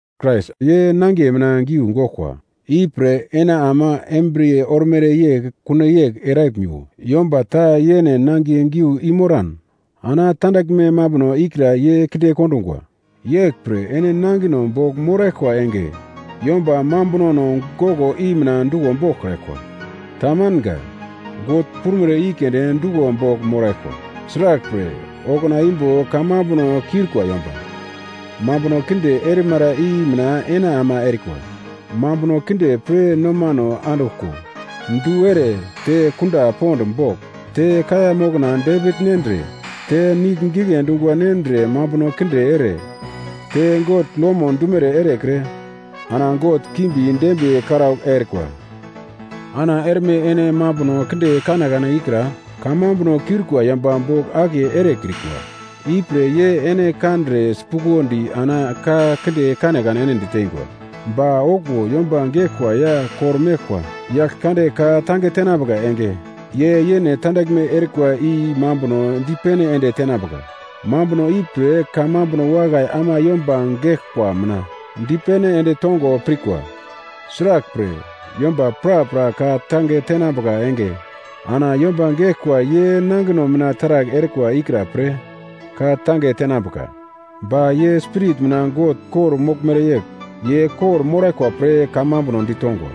Krais ye nangiye mina giu goglkwa. Ipre ene ama embriye ormere yegl kuno yegl eraglmiwo. Yomba ta yene nangiye giu i-moran ana tandaglme mambuno ikra ye kinde kondungwa. Yeglpre ene nangino bogl moraglkwa enge, yomba mambunono goglo i mina duglo boglkraglkwa. Tamanga, God prumere i keunde duglo bogl moraglkwa. Sraglpre, okuna imbo kamambuno kiurikwa yomba mambuno kinde erimara i mina ene ama erikwa, mambuno kinde pre nomano anduglko, du ere, te kunda pond bogl, te kaiya mokna depigl nendre, te nigl gigle dungwa nendre mambuno kinde ere, te God lomo dumere erekre, ana god kimbi dembiye karaugl erikwa. Ana erme ene mambuno kinde kanekane ikra kamambuno kiurikwa yomba bogl akiye erekrikwa. Ipre ye ene kandre sipuglodi ana ka kinde kanekane ene ditengwa. Ba okuwo yomba geglkwa ya kor-meglkwa Yaglkande ka-tange tenambuka enge, ye yene tandaglme erikwa i mambuno dipene ende tenambuka. Mambuno ipre kamambuno wakai ama yomba geglkwa mina dipene ende tongo pirkwa. Sraglpre, yomba prapra ka-tange tenambuka enge ana yomba geglkwa ye nangino mina taragl erikwa ikra-pre ka-tange tenambuka. Ba ye spirit mina God kor-moglmere yegl ye kor-moraglkwa pre kamambuno ditongwa.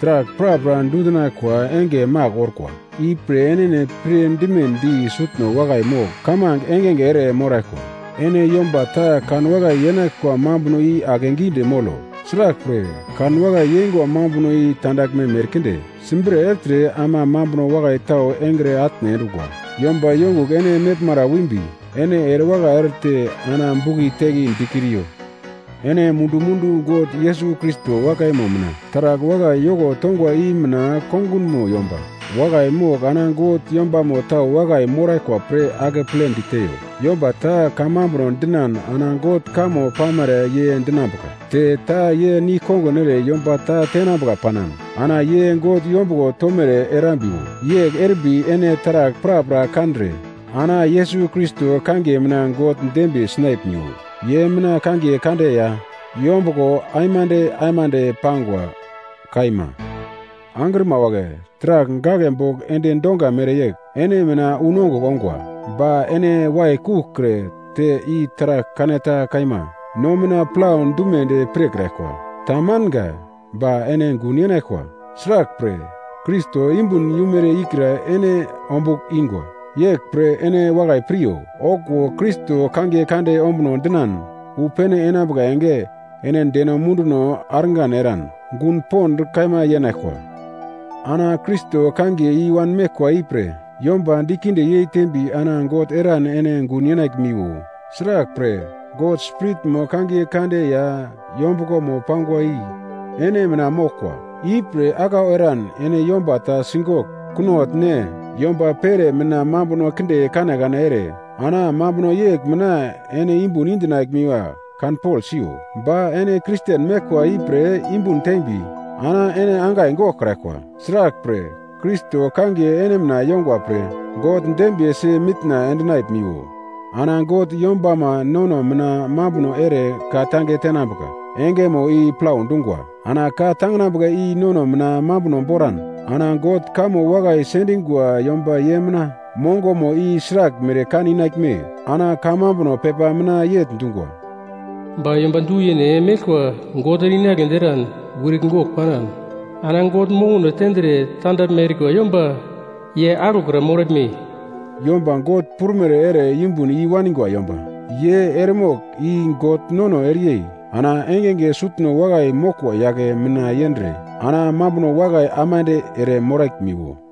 Taragl prapra dundinaglkwa enge magl orkwa. Ipre enene pir dimedi sutno wakai mogl kamange engenge ere moraglkwa. Ene yomba ta kanwakai yeinaglkwa mambuno i akegidi molo. Sraglpre, kanwakai yeingwa mambuno i tandaglme merkinde simbre ertre ama mambuno wakai tau engre atne endungwa. Yomba yongugl ene meglmara wimbi ene erewakai erete ana bugli-tegli dikriyo. Ene mundu-mundu God Yesus Krais wakaimo mina taragl wakai yoko tongwa i mina kongunmo yomba wakai mogl ana God yombamo tau wakai moraglkwa pre akepledi teiyo. Yomba ta kamambuno dinan ana God kamo pamere ye dinambuka, te ta ye nigl-kongun ere yomba ta tenambuka panan, ana ye God yombuglo tomere erambiwo. Yegl erimbi ene taragl prapra kandre ana Yesus Krais kangiye mina God dembiye sinaglmiwo. Ye mina kangiye kande ya yombuglomo aimande aimande pangwa. Kaima. Angrima wagle, taragl gaglebogl endi donga mereyegl ene mina unongugl ongwa. Ba ene waikuglkre te i taragl kaneta kaima no mina plau dumedi pirkraglkwa. Tamanga. Ba ene gun yenaglkwa. Sraglpre, Krais yumbun yumere ikra ene ombugl ingwa. Yeglpre ene wakai piryo, okuwo Krais kangiye kande ombuno dinan wu pene enambuka enge ene deno munduno argan eran gun pond kaima yenaglkwa. Ana Krais kangiye i-wan meglkwa ipre yomba dikinde yeitembi ana God eran ene gun yenaglmiwo, sraglpre, God Spiritmo kangiye kande ya yombuglomo pangwa i ene mina moglkwa. Ipre aglau eran ene yomba ta sigogl, kunogl ne, yomba pere mina mambuno kinde kanekane ere, ana mambuno yegl mina ene yumbun indinaglmiwa kanpogl siyo. Ba ene Kristen meglkwa ipre yumbun tembi, ana ene angai goglkraglkwa. Sraglpre, Krais kangiye ene mina yongwa pre God dembiyesi mitna endinaglmiwo. Ana God yombama nono mina mambuno ere ka-tange tenambuka engemo i plau dungwa. Ana ka-tanginambuka i nono mina mambuno boran, ana God kamo wakai sendingwa yomba ye mina mongomo i sraglmere kan inaglme? Ana kamambuno pepa mina yegl dungwa, “Ba yomba du-yene meglkwa God ere-inagledi eran wirigl gogl panan, ana God mokono tendre tandaglme erikwa yomba ye aglo kra moraglme?” Yomba God prumere ere yumbun i-wanigwa yomba, ye eremogl i God nono ereyei ana engenge sutno wakai moglkwa yagle mina yendre, ana mambuno wakai aimande ere moraglmiwo.